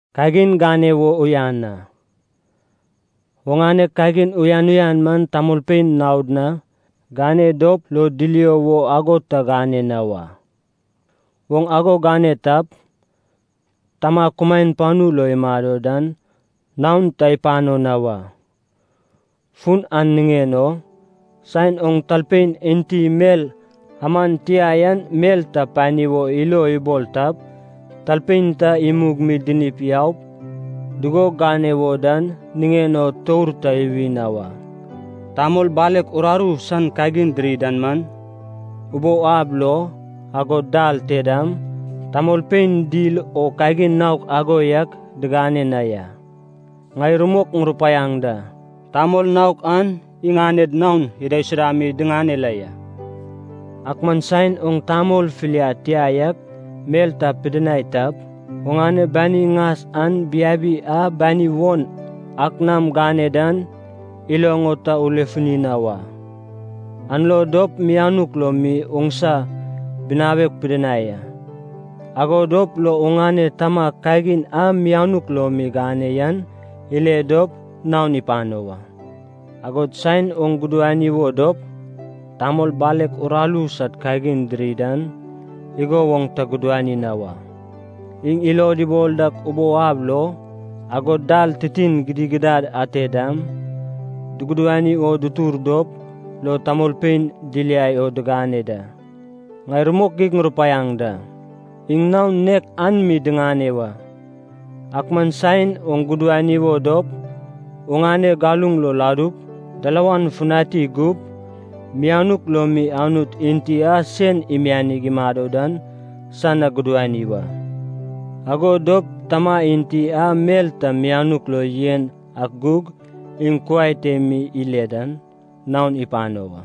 “Kagin gane wo uyan a, oŋane kagin uyan uyan man tamolpein naod na gane dop lo dilio wo ago ta gane na wa. Oŋ ago gane tap, Tama kumaen panu lo imado dan naon ta ipano na wa. Fun an niŋen o, saen oŋ talpein enti mel aman tia yan mel ta pani wo ilo ibol tap, talpein ta imug mi dinip yaup dugo gane wo dan niŋen o tour ta iwi na wa. Tamol balek uraru san kagin diri dan man, ubou ab lo, agod dal te dam, tamolpein dil o kagin naok ago yak digane na ya. Ŋai rumok ŋurupaiaŋ da, tamol naok an iŋaned naon idaisuda mi diŋane la ya. Ak man saen oŋ tamol filiad tia yak mel ta pidinai tap, oŋane bani ŋas an biabi a bani won ak nam gane dan iloŋ o ta ulefuni na wa. An lo dop mianuk lo mi oŋsa binawek pidinai a. Ago dop lo oŋane Tama kagin a mianuk lo mi gane yan ile dop, naon ipano wa. “Agod saen oŋ gudani wo dop, tamol balek uraru san kagin diri dan, igo woŋ ta gudani na wa. Iŋ ilod ibol dak ubou ab lo, agod dal titin gidigidad ate dam, dugudani wo dutur dop lo tamolpein diliai o digane da. Ŋai rumok geig ŋurupaiaŋ da, iŋ naon nek an mi diŋane wa. Ak man saen oŋ gudani wo dop oŋane galuŋ lo ladup, dalawan futani gup, mianuk lo mi Anut enti a sen imianig imado dan san na gudani wa. Ago dop Tama enti a mel ta mianuk lo yen ak gug, iŋ kuai te mi ile dan, naon ipano wa.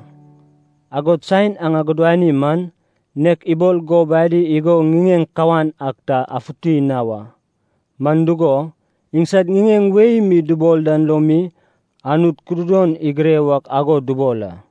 “Agod saen aŋ agudani man, nek ibol gob adi igo ŋiŋeŋ kawan ak ta afuti na wa. Man dugo, iŋsad ŋiŋeŋ wei mi dubol dan lo mi Anut kududon igure wak ago dubol a.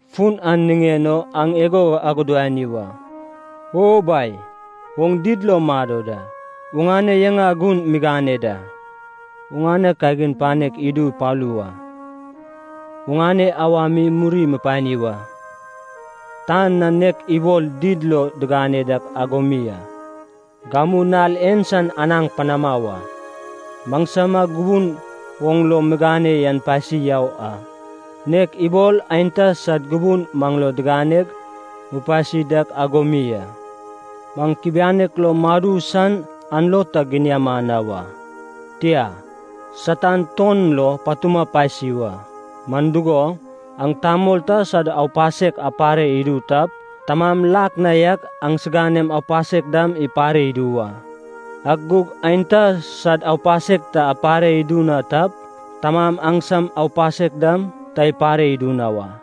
Fun an niŋen o aŋ igo agudani wa. O Bai, oŋ did lo mado da. Oŋane yaŋa gun migane da. Oŋane kagin panek idu ipalu wa. Oŋane awa mi muri mupani wa, tan na nek ibol did lo digane dak ago mi a. Gamu nal en san anaŋ panama wa. Maŋsama gubun oŋ lo migane yan pasi yau a, nek ibol aenta sad gubun maŋ lo diganeg mupasi dak ago mi a. Maŋ kubianek lo madu san an lo ta giniama na wa. Tia, Satan tuon lo patuma pasi wa. Man dugo, aŋ tamol ta sad aupasek apare idu tap, Tamam lak na yak aŋsiganem aupasek dam ipare idu wa. Ak gug aenta sad aupasek ta apare idu na tap, Tamam aŋsam aupasek dam ta ipare idu na wa.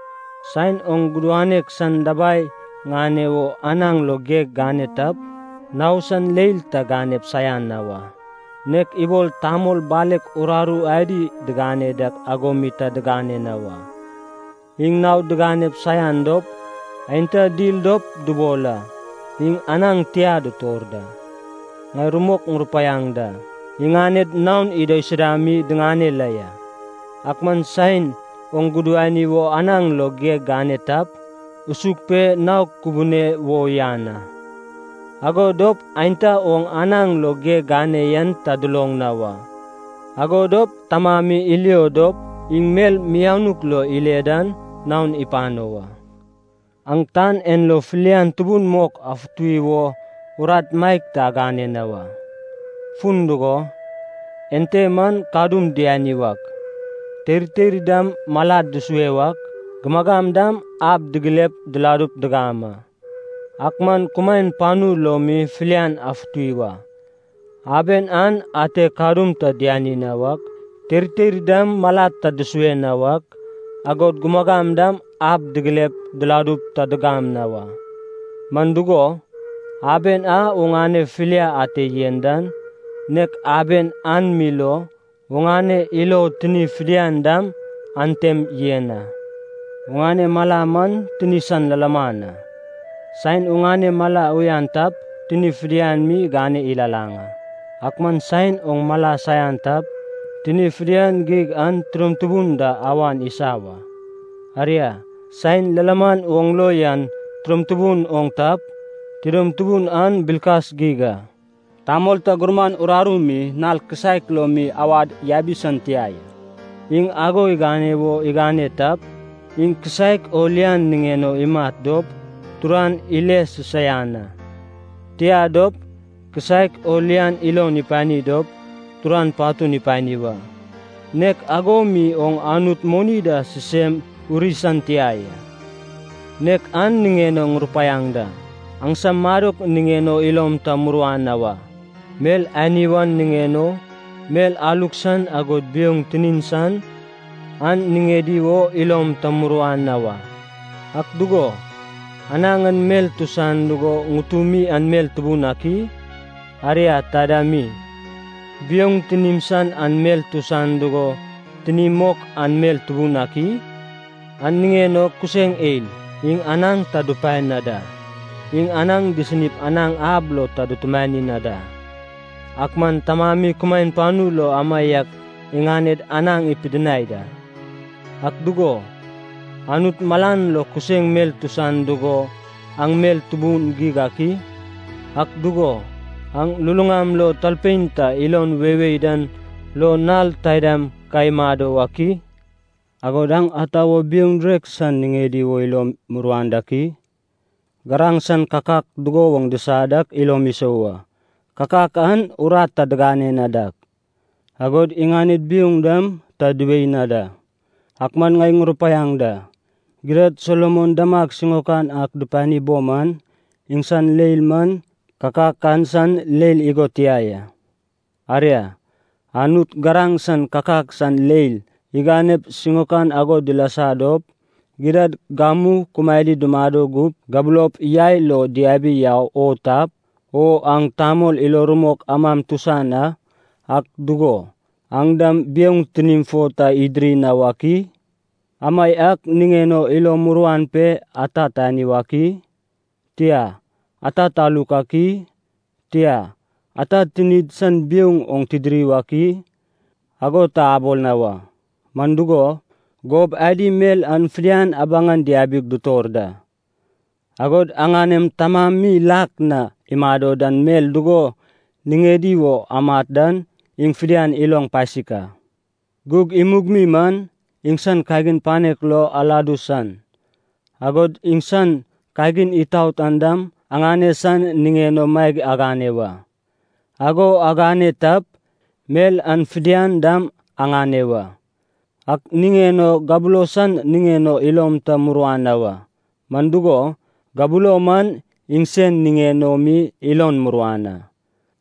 “Saen oŋ gudanek san dabai ŋane wo anaŋ lo geg gane tap, nao san leil ta ganep saian na wa, nek ibol tamol balek uraru adi digane dak ago mi ta gane na wa. Iŋ naod diganep saian dop aenta dil dop dubol a, ‘iŋ anaŋ tia ditor da.’ Ŋai rumok ŋurupaiaŋ da, iŋaned naon idaisuda mi diŋane la ya. Ak man saen oŋ gudani wo anaŋ lo geg gane tap, usug pe nao kubune wo uyan a. Ago dop aenta oŋ anaŋ lo geg gane yan ta duloŋ na wa. Ago dop Tama mi ilio dop, iŋ mel mianuk lo ile dan, naon ipano wa. “Aŋ tan en lo filian tubun mok afuti wo urat maeg ta agane na wa. Fun dugo, ente man kadum diani wak, teirteir dam malad dusue wak, gumagam dam ab digilep diladup digam a. Ak man kumaen panu lo mi filian afuti wa. Aben an ate kadum ta diani na wak, teirteir dam malad ta dusue na wak, agod gumagam dam ab digilep diladup ta digam na wa. Man dugo, aben a oŋane filia ate yen dan, nek aben an mi lo oŋane ilo tini fidian dam antem yen a. “Oŋane mala man tini san lilaman. Saen oŋane mala uyan tap, tini fidian mi igane ilalaŋ a. Ak man saen oŋ mala saian tap, tini fidian geig an tidom tubun da awan isa wa. Aria, saen lilaman oŋ lo yan tidom tubun oŋ tap, tidom tubun an bilkas geig a. “Tamol ta gurman uraru mi nal kisaek lo mi awad yabi san tia ya. Iŋ ago igane wo igane tap, iŋ kisaek o lian niŋen o imat dop, turan ile sisaian a. Tia dop, kisaek o lian ilon ipani dop, turan patun ipani wa. Nek ago mi oŋ Anut moni da sisem uri san tia ya. “Nek an niŋen o ŋurupaiaŋ da, aŋsam madok niŋen o ilom ta muruan na wa. Mel ani wan niŋen o, mel aluk san agod biouŋ tinim san an niŋedi wo ilom ta muruan na wa. Ak dugo, anaŋ an mel tusan dugo ŋutumi an mel tubun ak i? Aria, taida mi, biouŋ tinim san an mel tusan dugo tinimi mok an mel tubun ak i? An niŋen o kuseŋ eil, iŋ anaŋ ta dupae na da, iŋ anaŋ disinip anaŋ ab lo ta dutumani na da, ak man Tamami kumaen panu lo amaiak iŋaned anaŋ ipidinai da. Ak dugo, Anut malan lo kuseŋ mel tusan dugo aŋ mel tubun geig ak i? Ak dugo, aŋ luluŋam lo talpein ta ilon weiwei dan lo nal taidam ka imado wak i? Agod aŋ ata wo biouŋ direk san niŋedi wo ilom muruan dak i? Garaŋ san kakak dugo woŋ disa dak ilom isou a. Kakak an urat ta digane na dak, agod iŋaned biouŋ dam ta diwei na da. Ak man ŋai ŋurupaiaŋ da, gidad Solomon damag siŋaokan ak dupani bo man, iŋsan leil man kakak an san leil igo tia ya. Aria, Anut garaŋ san kakak san leil iganep siŋaokan ago dilasa dop, gidad gamu kumaedi dumado gup gabulop yai lo diabiau o tap, o aŋ tamol ilo rumok amam tusan a, ak dugo, aŋ dam biouŋ tinim fo ta idiri na wak i? Amaiak niŋen o ilom muruan pe ‘ata tani wak i?’ tia, ‘ata taluk ak i?’ tia, ‘ata tinid san biouŋ oŋ tidiri wak i?’ ago ta abol na wa. Man dugo, gob adi mel an fidian abaŋan diabi dutor da. Agod aŋanem Tamami lak na imado dan mel dugo niŋedi wo amat dan iŋ fidian iloŋ pasik a. Gug imug mi man, iŋsan kagin panek lo aladu san, agod iŋsan kagin itaot an dam aŋane san niŋen o maeg agane wa. Ago agane tap, mel an fidian dam aŋane wa. “Ak niŋen o gabulo san niŋen o ilom ta muruan na wa, man dugo, gabulo man iŋsen niŋen o mi ilon muruan a.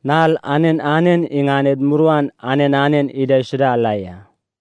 Nal anen anen iŋaned muruan anen anen idaisuda la ya.